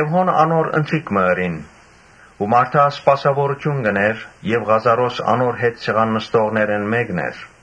Հոն՝ անոր ընթրիք մը պատրաստեցին ու Մարթա սպասաւորութիւն կ’ընէր։ Ղազարոս անոր հետ սեղան նստողներէն մէկն էր։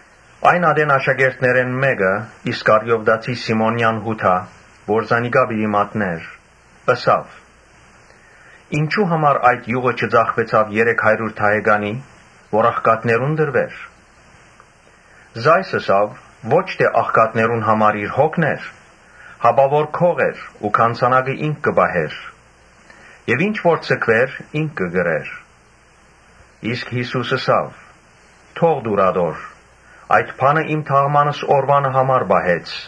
Այն ատեն աշակերտներէն մէկը՝ Իսկարիովտացի Սիմոնեան Յուդան, որ զանիկա պիտի մատնէր, ըսաւ. «Ինչո՞ւ համար այդ իւղը չծախուեցաւ երեք հարիւր դահեկանի, որ աղքատներուն տրուէր»։ Ասիկա ըսաւ, թ՛չ թէ աղքատները հոգալուն համար, հապա որ գող էր ու գանձանակը ինք կը պահէր եւ ինչ որ ձգուէր՝ ինք կը կրէր։ Իսկ Յիսուս ըսաւ. «Թո՛ղ տուր ատոր, այդ բանը իմ թաղմանս օրուանը համար պահեց։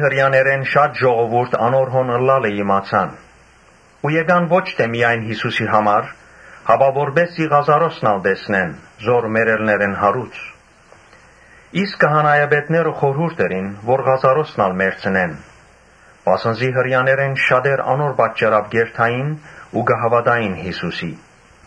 Հրեաներէն շատ ժողովուրդ անոր հոն ըլլալը իմացան ու եկան ո՛չ միայն Յիսուսին համար, հապա որպէս զի Ղազարոսն ալ տեսնեն, որ մեռելներէն յարուցանած էր։ Իսկ քահանայապետները խորհուրդ ըրին, որ Ղազարոսն ալ մեռցնեն. Վասն զի Հրեաներէն շատեր անոր պատճառաւ կ’երթային ու կը հաւատային Յիսուսին։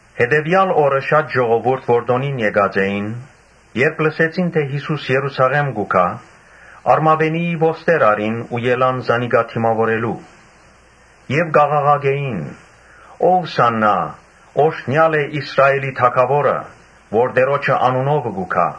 Հետեւեալ օրը շատ ժողովուրդ, որ տօնին եկած էին, երբ լսեցին թէ Յիսուս Երուսաղէմ կու գայ, Արմաւենիի ոստեր առին ու ելան զանիկա դիմաւորելու եւ կ’աղաղակէին. «Ովսա՛ննա, օրհնեալ է Իսրայէլի թագաւորը՝ որ Տէրոջը անունովը կու գայ»։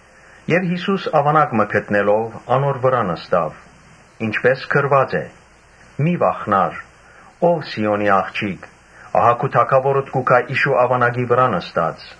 Յիսուս աւանակ մը գտնելով՝ անոր վրայ նստաւ, ինչպէս գրուած է. «Մի՛ վախնար, ո՛վ Սիօնի աղջիկ, ահա քու Թագաւորդ կու գայ իշու աւանակի վրայ նստած»։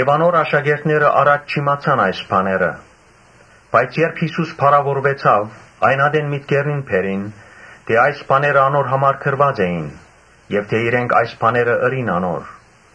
Անոր աշակերտները առաջ չիմացան այն բաները, բայց երբ Յիսուս փառաւորուեցաւ, այն ատեն մտքերնին բերին թէ այս բաները անոր համար գրուած էին եւ թէ իրենք այս բաները ըրին անոր։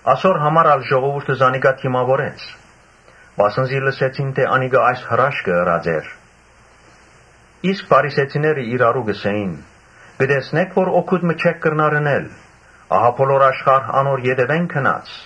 Ասոր համար ալ ժողովուրդը զանիկա դիմաւորեց, վասն զի լսեցին թէ անիկա այս հրաշքը ըրած էր։ Իսկ փարիսեցիները իրարու կ’ըսէին. «Կը տեսնէ՞ք որ օգուտ մը չենք կրնար ընել. ահա բոլոր աշխարհ անոր ետեւէն գնաց»։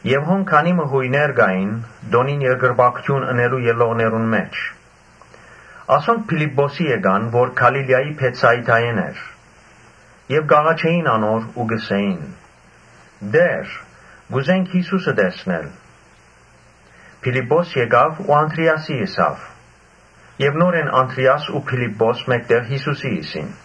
Քանի մը Յոյներ կային տօնին երկրպագութիւն ընելու ելլողներուն մէջ։ Ասոնք Փիլիպպոսին եկան, որ Գալիլիայի Բեթսայիդայէն էր եւ կ’աղաչէին անոր ու կ’ըսէին. «Տէ՛ր, կ’ուզենք Յիսուսը տեսնել»։ Փիլիպպոս եկաւ ու Անդրէասին ըսաւ եւ յետոյ Անդրէաս ու Փիլիպպոս մէկտեղ Յիսուսին ըսին։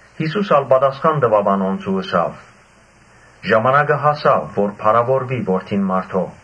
Յիսուս ալ պատասխան տուաւ անոնց ու ըսաւ. «Ժամանակը հասաւ, որ փառաւորուի Որդին մարդոյ։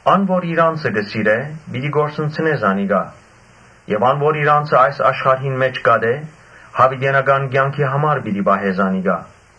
Ան որ իր անձը կը սիրէ, պիտի կորսնցնէ զանիկա եւ ան որ իր անձը այս աշխարհին մէջ կ’ատէ, յաւիտենական կեանքին համար պիտի պահէ զանիկա։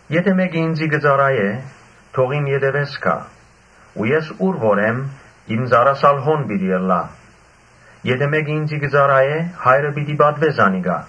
Եթէ մէկը ինծի կը ծառայէ, թող իմ ետեւէս գայ ու ես ո՛ւր որ եմ, իմ ծառաս ալ հոն պիտի ըլլայ. եթէ մէկը ինծի կը ծառայէ, Հայրը պիտի պատուէ զանիկա»։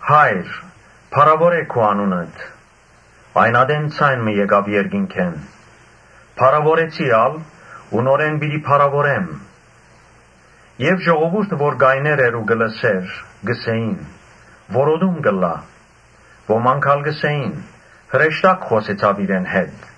‘Հա՛յր, փառաւորէ քու անունդ’»։ Այն ատեն ձայն մը եկաւ երկնքէն. «Փառաւորեցի ալ՝ ու նորէն պիտի փառաւորեմ»։ Ժողովուրդը, որ կայներ էր ու կը լսէր, կ’ըսէին. «Որոտում կ’ըլլայ»։ Ոմանք ալ կ’ըսէին. «Հրեշտակ խօսեցաւ իրեն հետ»։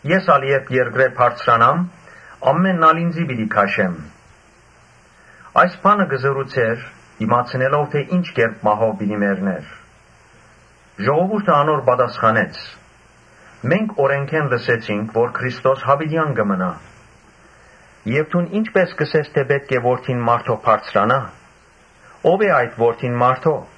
Ես ալ երբ երկրէն բարձրանամ, ամէնքդ ալ ինծի պիտի քաշեմ»։ Այս բանը կ’ըսէր՝ իմացնելով թէ ի՛նչ կերպ մահով պիտի մեռնէր։ Ժողովուրդը անոր պատասխանեց. «Մենք օրէնքէն լսեցինք թէ Քրիստոս յաւիտեան կը մնայ եւ դուն ի՞նչպէս կ’ըսես թէ պէտք է Որդին մարդոյ բարձրանայ. ո՞վ է այդ Որդին մարդոյ»։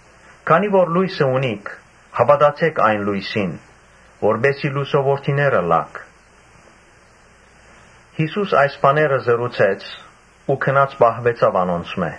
Քանի որ լոյսը ունիք, հաւատացէ՛ք այն լոյսին, որպէս զի լուսոյ որդիներ ըլլաք»։ Յիսուս այս բաները խօսեցաւ ու գնաց պահուեցաւ անոնցմէ։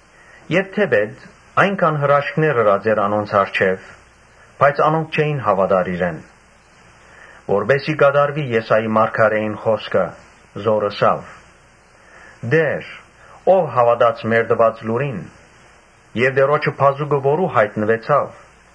Թէպէտ այնքան հրաշքներ ըրած էր անոնց առջեւ, բայց անոնք չէին հաւատար իրեն. Որպէս զի կատարուի Եսայի մարգարէին խօսքը, որ ըսաւ. «Տէ՛ր, ո՞վ հաւատաց մեր տուած լուրին եւ Տէրոջը բազուկը որո՞ւ յայտնուեցաւ»։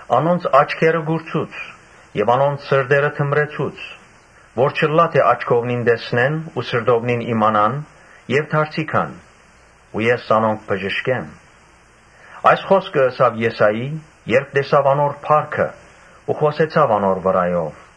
«Անոնց աչքերը կուրցուց եւ անոնց սրտերը թմրեցուց, որ չըլլայ թէ աչքովնին տեսնեն ու սրտովնին իմանան եւ դարձի գան ու ես զանոնք բժշկեմ»։ Այս խօսքը ըսաւ Եսային՝ երբ տեսաւ անոր փառքը ու խօսեցաւ անոր վրայով։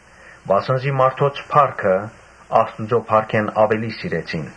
Վասն զի մարդոց փառքը Աստուծոյ փառքէն աւելի սիրեցին։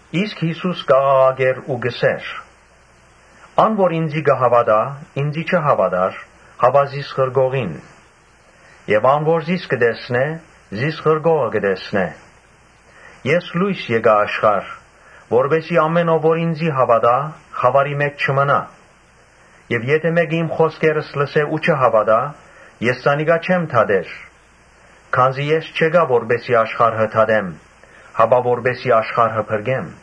Յիսուս կ’աղաղակէր ու կ’ըսէր. «Ան որ ինծի կը հաւատայ, ինծի չի հաւատար, հապա զիս ղրկողին. Եւ ան որ զիս կը տեսնէ, զիս ղրկողը կը տեսնէ։ Ես իբր լոյս եկայ աշխարհ, որպէս զի ամէն ո՛վ որ ինծի հաւատայ, խաւարի մէջ չմնայ։ Եթէ մէկը իմ խօսքերս լսէ ու չհաւատայ, ես զանիկա պիտի չդատեմ, քանզի ես չեկայ որպէս զի աշխարհը դատեմ, հապա որպէս զի աշխարհը փրկեմ։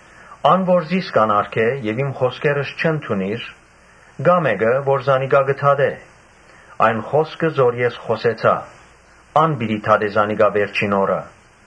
Ան, որ զիս կ’անարգէ եւ իմ խօսքերս չընդունիր, կայ մէկը որ զանիկա պիտի դատէ. այն խօսքը որ ես խօսեցայ, ան պիտի դատէ զանիկա վերջին օրը։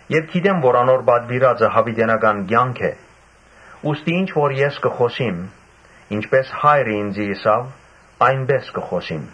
Եւ գիտեմ թէ անոր պատուիրածը յաւիտենական կեանք է. ուստի ինչ որ ես կը խօսիմ, ինչպէս Հայրը ինծի ըսաւ, այնպէս կը խօսիմ»։